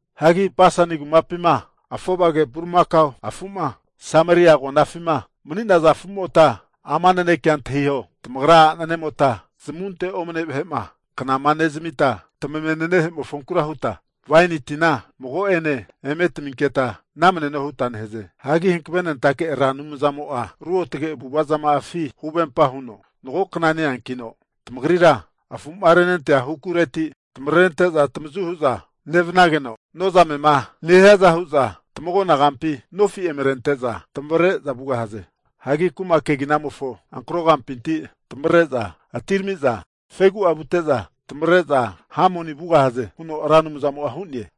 Hagi Basani kumapinti afovage bulimakao afu'ma Sameria agonafima mani'naza afumota ama nanekea antahiho, Tamagra a'nemota zamunte'ma omane vahe'ma knama nezamita, tamavenenehe'mofonkura huta, waini tina mago'ane eme taminketa namaneno huta nehaze. Hagi hankavenentake Ra Anumzamo'a ruotge avu'ava zama'afi huvempa huno, Magokna neankino tamagrira afu'ma renentaza hukureti tamarente'za tamavazu hu'za nevanageno, nozamema nehiaza hu'za tamagona kampi nofi' eme rente'za tamavre'za vugahaze. Hagi kuma keginamofo ankaro kampinti tamavre'za atiramiza fegu'a vute'za, tamavre'za Hamoni vugahaze huno Ra Anumzamo'a hu'ne.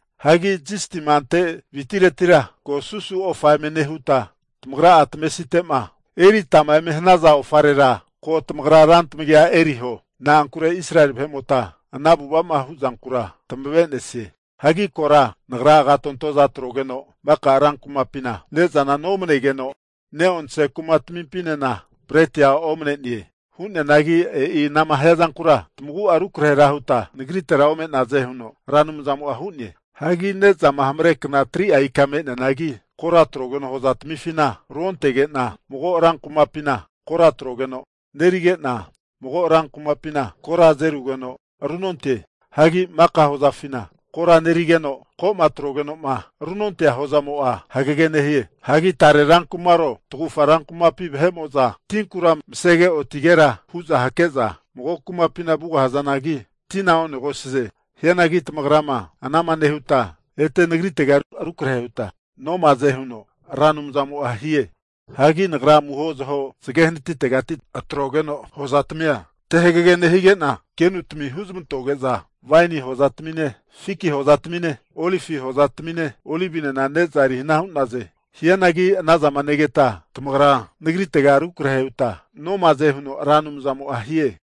Hagi zisti'ma ante witiretira ko susu ofa eme nehuta, tamagra'a tamavesite'ma eritama eme hanaza ofarera ko tamagra rantamagia eriho. Na'ankure Israeli vahe'mota ana avu'ava'ma huzankura tamave'nesie. Hagi kora Nagra agatontoza atrogeno maka rankumapina ne'zana nomanegeno, neonse kumatamimpinena bretia omane'ne. Hu'neanagi e'i anama hiazankura tamagu'a rukrahe huta Nagritera ome'naze huno Ra Anumzamo'a hu'ne. Hagi nezama hamarekna 3'a ika me'neanagi kora atrogeno hoza tamifina runontege'na, mago rankumapina kora atrogeno nerige'na, mago rankumapina kora azerugeno runonte. Hagi mago hozafina kora nerigeno, ko'ma atroge'noma runontea hozamo'a hagege nehie. Hagi tare rankumaro tagufa rankumapi vahe'mo'za tinkura masege otigera hu'za hakeza mago kumapina vugahazanagi tina onegosaze. Hianagi tamagrama anama nehuta ete Nagritega rukrahe huta nomaze huno Ra Anumzamo'a hie. Hagi Nagra amuho zaho zage hanatitegati huntogeno hozatamia te hagege nehige'na, kenutami huzmantoge'za waini hozatamine fiki hozatamine, olivi zafa hozatamine, olivinena ne'za eri hana hu'naze. Hianagi tamagra anazama negeta tamagra ete Nagritega rukrahe huta nomaze huno Ra Anumzamo'a hie.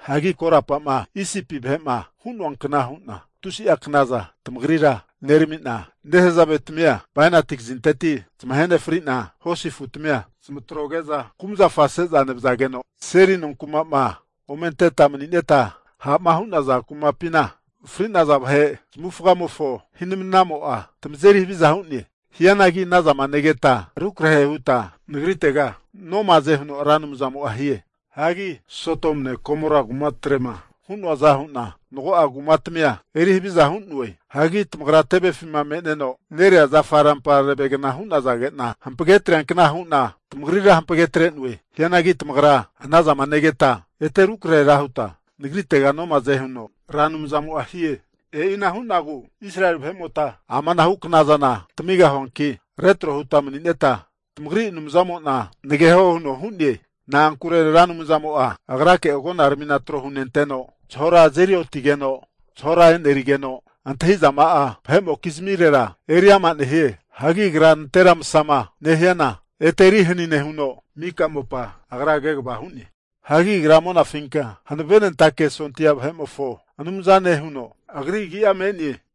Hagi korapama Isipi vahe'ma hu'noa kna hu'na tusi'a knaza tamagrira nerami'na, nehazave tamia bainati kazinteti zamahe nefri'na hosi afutamia zamatroge'za kumazafa seza nevazageno, seli nonkuma'ma ome anteta mani'neta ha'ma hu'naza kumapina fri'naza vahe zamavufagamofo hi'manamo'a tamazeri haviza hu'ne. Hianagi ana zama negeta rukrahe huta Nagritega nomaze huno Ra Anumzamo'a hie. Hagi Sodomune Gomora kumatre'ma hu'noaza hu'na, mago'a kumatamia eri haviza hu'noe. Hagi tamagra tevefima me'neno nerea zafa rampagna hu'nazagena, hampage atreankna hu'na tamagrira hampage atre'noe. Hianagi tamagra anazama negeta ete rukrahera huta Nagritega nomaze huno Ra Anumzamo'a hie. E'ina hu'nagu Israeli vahe'mota ama anahu knaza tamigahuanki, retro huta manineta tamagri Anumzamo'na nageho huno hu'ne. Na'ankure Ra Anumzamo'a Agrake agonaramina tro hunenteno, zahora azeri otigeno zahora enerigeno, antahizama'a vahe'mokizmirera eri ama nehie. Hagi Agra nantera masama nehiana ete eri hani nehuno, mika mopa Agra kegava hu'ne. Hagi Agra Monafinka Hanavenentake sondia vahe'mofo Anumzane huno Agri agi'a me'ne!